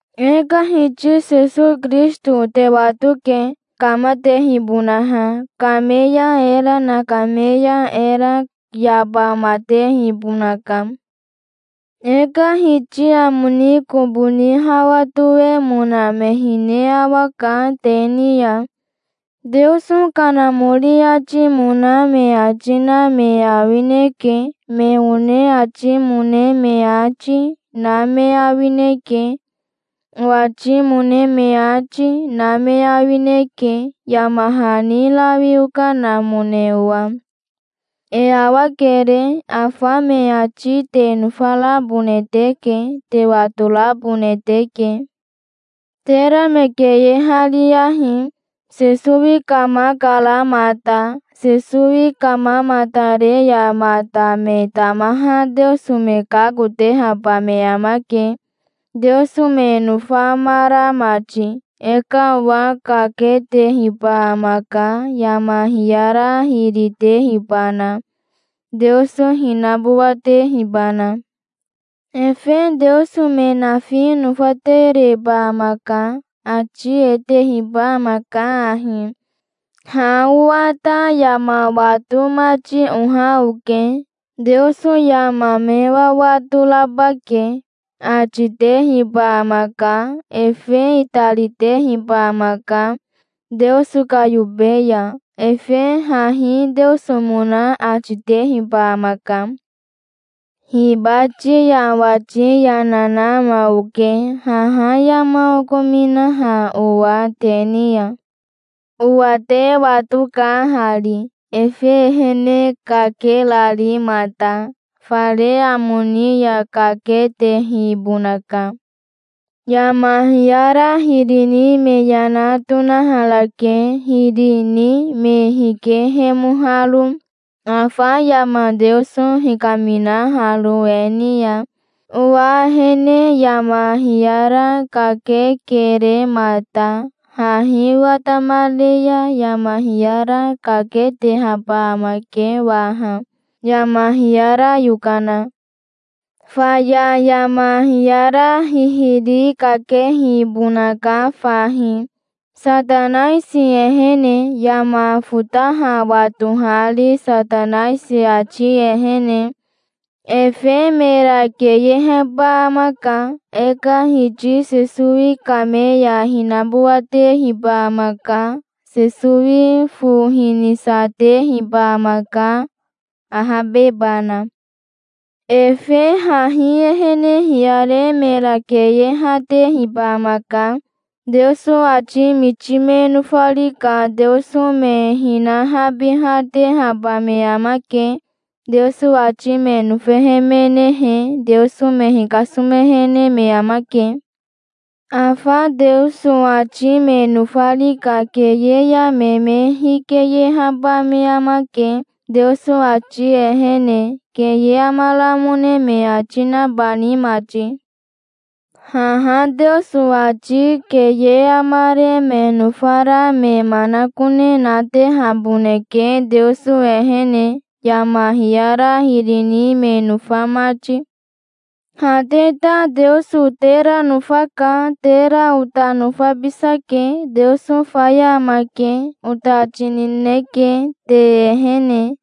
E ka Hiti Sesowi Kirisito te watoke, kamatehibonaha. Kame ya era nakame ya era yabamatehibonaka. E ka Hiti amo ni kobo ni hawa toemona me hine awaka te ni ya. Teoso Kanamori atimona me ati na me awineke. Me one atimone me ati, na me awineke. Owatimone me ati, na me awineke, yama hani rawi okanamone owa. E awakere. Afa me ati te nofarabone teke. Te watorabone teke. Tera me keyehariyahi. Sesowi kamakara mata. Sesowi kamamatare ya mata me tamaha Teoso me kakotehaba me amake, Teoso me nofamara mati. E ka owa kaketehiba amaka, yama hiyara hiri tehibana, Teoso hinabowatehibana. Efe teoso me nafi nofatereba amaka. Ati e tehiba amaka ahi: "Ha owa ta yama wato mati oha oke. Teoso yama me wawato raba ke", ati tehiba amaka. Efe itaritehiba amaka, Teoso ka yobe ya. Efe hahi Teosomona ati tehiba amaka. Hibati ya owati yana na ama oke, haha yama okominaha owa te ni ya. Owa te watoka hari, efe ehene kakerari mata. Fare amo ni ya kaketehibonaka. Yama hiyara hiri ni me yana tonaharake, hiri ni me hikehemoharo, afa yama Teoso hikaminaharo e ni ya. Owa ehene yama hiyara kakekere mata. Hahi watamare ya yama hiyara kaketehaba amake waha, yama hiyara yokana. Faya yama hiyara hihiri kakehibonaka fahi, Satanaisi ehene, yama fotaha watohari Satanaisi ati ehene. Efe mera keyeheba amaka. E ka Hiti Sesowi kame ya hinabowatehiba amaka. Sesowi fo hinisatehiba amaka, ahabebana. Efe hahi ehene hiyare mera keyehatehiba amaka. Teoso ati miti me nofari ka Teoso me hinahabihatehaba me amake. Teoso ati me nofehemenehe Teoso me hikasomehene me amake. Afa Teoso ati me nofari ka keye ya me me hikeyehaba me amake, Teoso ati ehene, keye amaramone me ati nabani mati. Haha Teoso ati keye amare me nofara me manakone natehaboneke Teoso ehene, yama hiyara hiri ni me nofa mati. Ha te ta Teoso tera nofaka. Tera ota nofabisake. "Teoso faya amake", ota ati nineke, te ehene.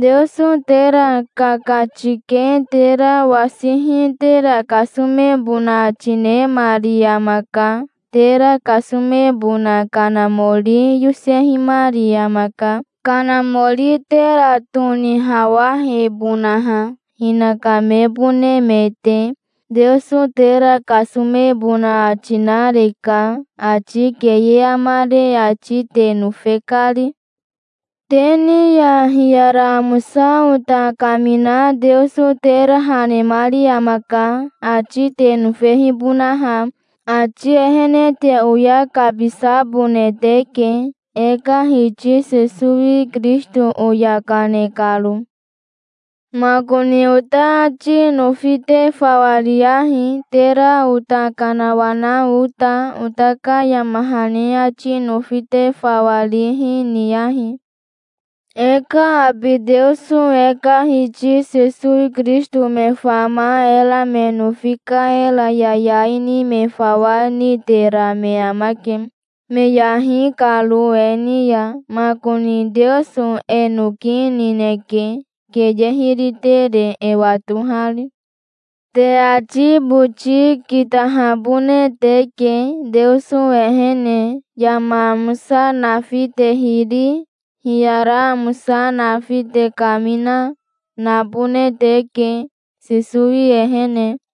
Teoso tera kakatike tera wasihi tera kasomebona ati nemari amaka. Tera kasomebona Kanamori yosehimari amaka, Kanamori tera tonihawahebonaha, hinaka mebone me te. Teoso tera kasomebona ati nareka, ati keye amare ati te nofe kari. Te ni ya hiyara amosa ota kamina Teoso tera ha nemari amaka, ati te nofehibonaha. Ati ehene te oya kabisabone teke, e ka Hiti Sesowi Kirisito oya kane karo. Makoni ota ati nofi te fawa riyahi, tera ota kanawana ota. Ota ka yama hani ati nofi te fawa rihi, niyahi. E ka abi Teoso e ka Hiti Sesowi Kirisito me fama era me nofi ka era yayai ni me fawa nitera me amake, me yahi karo e ni ya. Makoni Teoso e noki nineke, keye hiri tere e watohari. Te ati boti kitahabone teke, Teoso ehene. Yama amosa nafi te hiri, hiyara amosa nafi te kamina, nabone teke, Sesowi ehene.